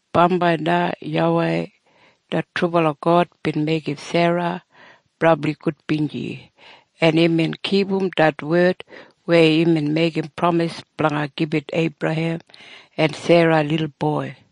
Bambai na YAWEI det trubala God bin meigim Sera brabli gudbinji, en imbin kipum det wed weya imbin meigim pramis blanga gibit Eibrahem en Sera lilboi.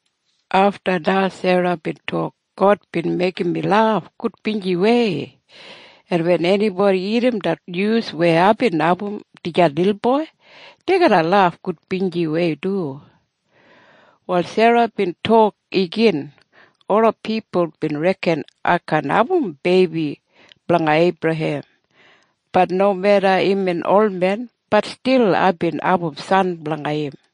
Afta na Sera bin tok, “God bin meigim mi laf gudbinjiwei. En wen enibodi irrim det nyus weya aibin abum dijan lilboi, dei garra laf gudbinjiwei du.” Wal Sera bin tok igin, “Ola pipul bin reken ai kaan abum beibi blanga Eibrahem. Bat nomeda imbin olmen, bat stil aibin abum san blanga im.”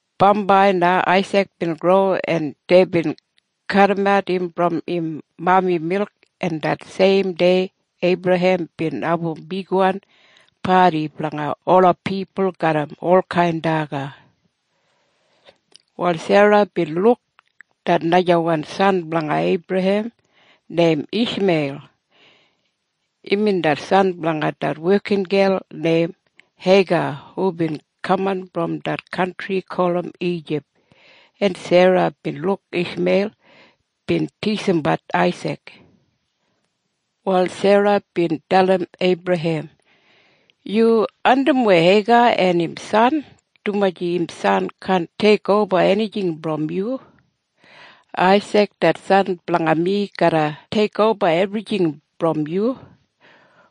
Bambai na Aisik bin gro, en deibin kadimat im brom im mami milk, en det seim dei Eibrahem bin abum bigwan padi blanga ola pipul garram olkain daga. Wal Sera bin luk det najawan san blanga Eibrahem neim Ishmeil. Imbin det san blanga det wekingel neim Heiga hubin kaman brom det kantri gulum Ijip. En Sera bin luk Ishmeil bin tisimbat Aisik. Wal Sera bin dalim Eibrahem, “Yu andimwei Heiga en im san, dumaji im san kaan teikoba enijing brom yu. Aisik det san blanga mi garra teikoba ebrijing brom yu.”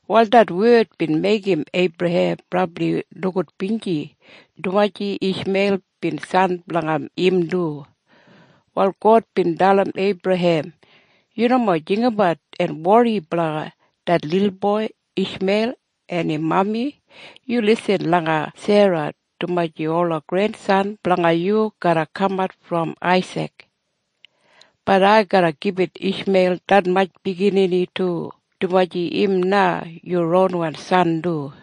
Wal det wed bin meigim Eibrahem brabli nogudbinji, dumaji Ishmeil bin san blanga im du. Wal God bin dalim Eibrahem, “Yu nomo jinggabat en wori blanga det lilboi Ishmeil en im mami. Yu lisin langa Sera, dumaji ola grensan blanga yu garra kamat brom Aisik. Bat ai garra gibit Ishmeil detmatj biginini du, dumaji im na yu ronwan san du.”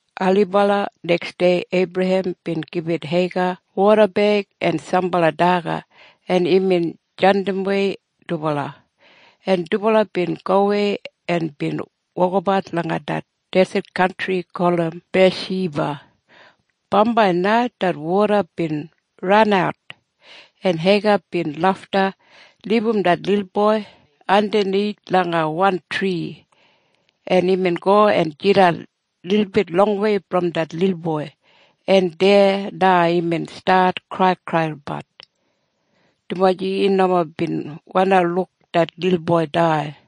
Ailibala neksdei Eibrahem bin gibit Heiga wodabeig en sambala daga, en imbin jandimwei dubala. En dubala bin gowei en wokabat langa det deset kantri gulum Biyashiba. Bambai na det woda bin ranat, en Heiga bin lafta libum det lilboi andanith langa wan tri, en imbin go en jidan lilbit longwei brom det lilboi, en deya na imbin stat kraikraibat, dumaji im nomo bin wandi luk det lilboi dai.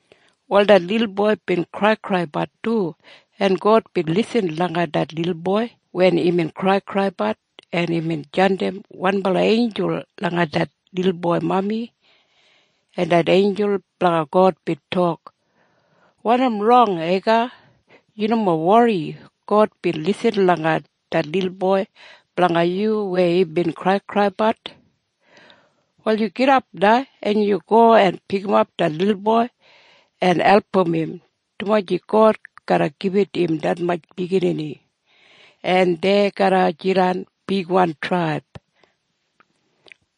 Wal det lilboi bin kraikraibat du, en God bin lisin langa det lilboi wen imbin kraikraibat, en imbin jandim wanbala einjul langa det lilboi mami, en det einjul blanga God bin tok, “Wanim rong Heiga? Yu nomo wori. God bin lisin langa det lilboi blanga yu weya imbin kraikraibat. Wal yu gidap na, en yu go en pikimap det lilboi en album im, dumaji God garra gibit im detmatj biginini, en dei garra jidan bigwan traib.”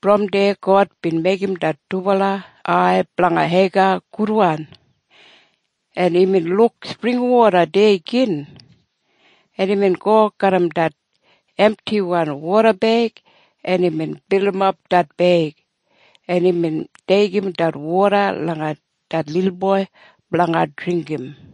Brom deya God bin meigim det dubala ai blanga Heiga gudwan, en imbin luk springwoda deya gin, en imbin go garram det emtiwan wodabeig, en imbin bilimap det beig, en imbin deigim det woda langa det lilboi blanga dringgim.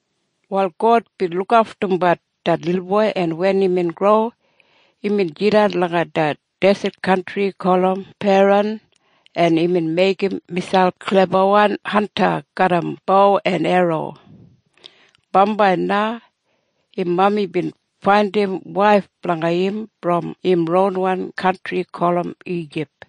Wal God bin lukaftumbat det lilboi, en wen imbin gro, imbin jidan langa det deset kantri gulum Paran, en imbin meigim miselp klebawan hanta garram bo en erro. Bambai na im mami bin faindim waif blanga im brom im ronwan kantri gulum Ijip.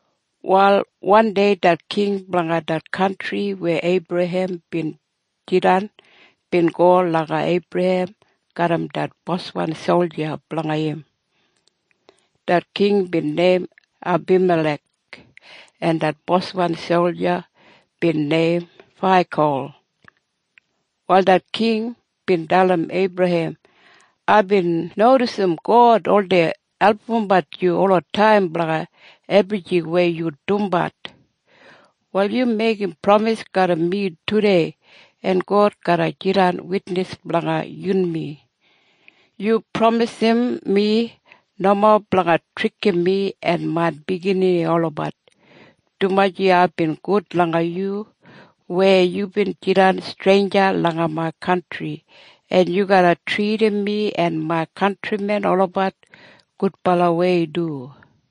Wal wandei det king blanga det kantri weya Eibrahem bin jidan bin go langa Eibrahem garram det boswan solja blanga im. Det king bin neim Abimalek, en det boswan solja bin neim Faikol. Wal det king bin dalim Eibrahem, “Aibin nodisim God oldei albumbat yu olataim blanga ebrijing weya yu dumbat. Wal yu meigim pramis garram mi tudei, en God garra jidan witnis blanga yunmi. Yu pramisim mi nomo blanga trikim mi en main biginini olabat, dumaji aibin gud langa yu weya yubin jidan streinja langa main kantri, en yu garra tridim mi en main kantrimen olabat gudbalawei du.”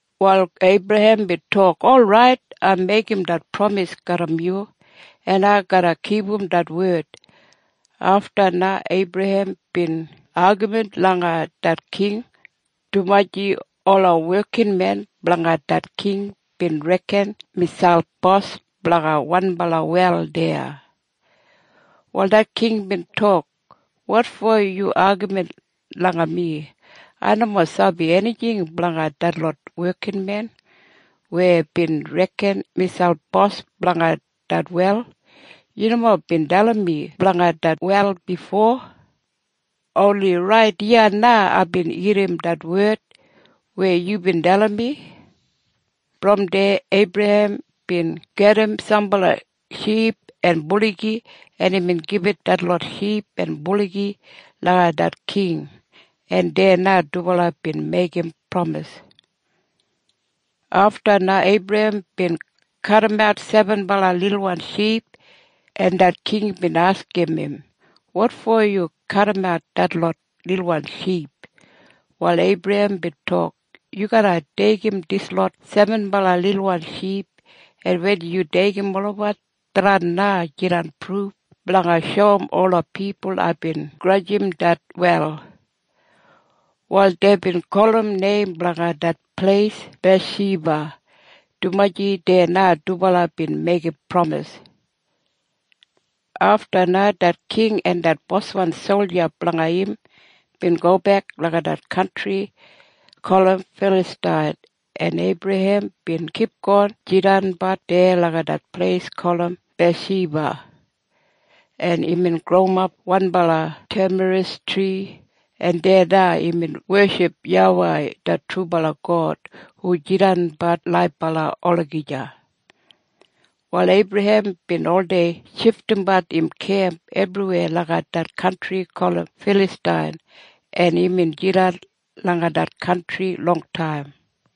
Wal Eibrahem bin tok, “Orait. Ai meigim det pramis garram yu. En ai garra kipum det wed.” Afta na Eibrahem bin agamin langa det king, dumaji ola wekinmen blanga det king bin reken miselp bos blanga wanbala wel deya. Wal det king bin tok, “Wotfo yu agamin langa mi. Ai nomo sabi enijing blanga detlot wekinmen weya bin reken miselp bos blanga det wel. Yu nomo bin dalim mi blanga det wel bifo. Oni rait iya na aibin irrim det wed weya yubin dalim mi.” Brom deya Eibrahem bin gajim sambala ship en buligi, en imbin gibit detlot ship en buligi langa det king, en deya na dubala bin meigim pramis. Afta na Eibrahem bin kadimat sebenbala lilwan ship, en det king bin askim im, “Wotfo yu kadimat detlot lilwan ship?” Wal Eibrahem bin tok, “Yu garra deigim dislot sebenbala lilwan ship, en wen yu deigim olabat, tharran na jidan pruf blanga shoum ola pipul aibin grajim det wel.” Wal deibin gulum neim blanga det pleis Biyashiba, dumaji deya na dubala bin meigim pramis. Afta na det king en det boswan solja blanga im bin gobek langa det kantri gulum Filastain, en Eibrahem bin kipgon jidanbat deya langa det pleis gulum Biyashiba, en imbin growimap wanbala temarisktri, en deya na imbin weship YAWEI det trubala God hu jidanbat laibala olagija. Wal Eibrahem bin oldei shifdimbat im kemp ebriweya langa det kantri gulum Filastain, en imbin jidan langa det kantri longtaim.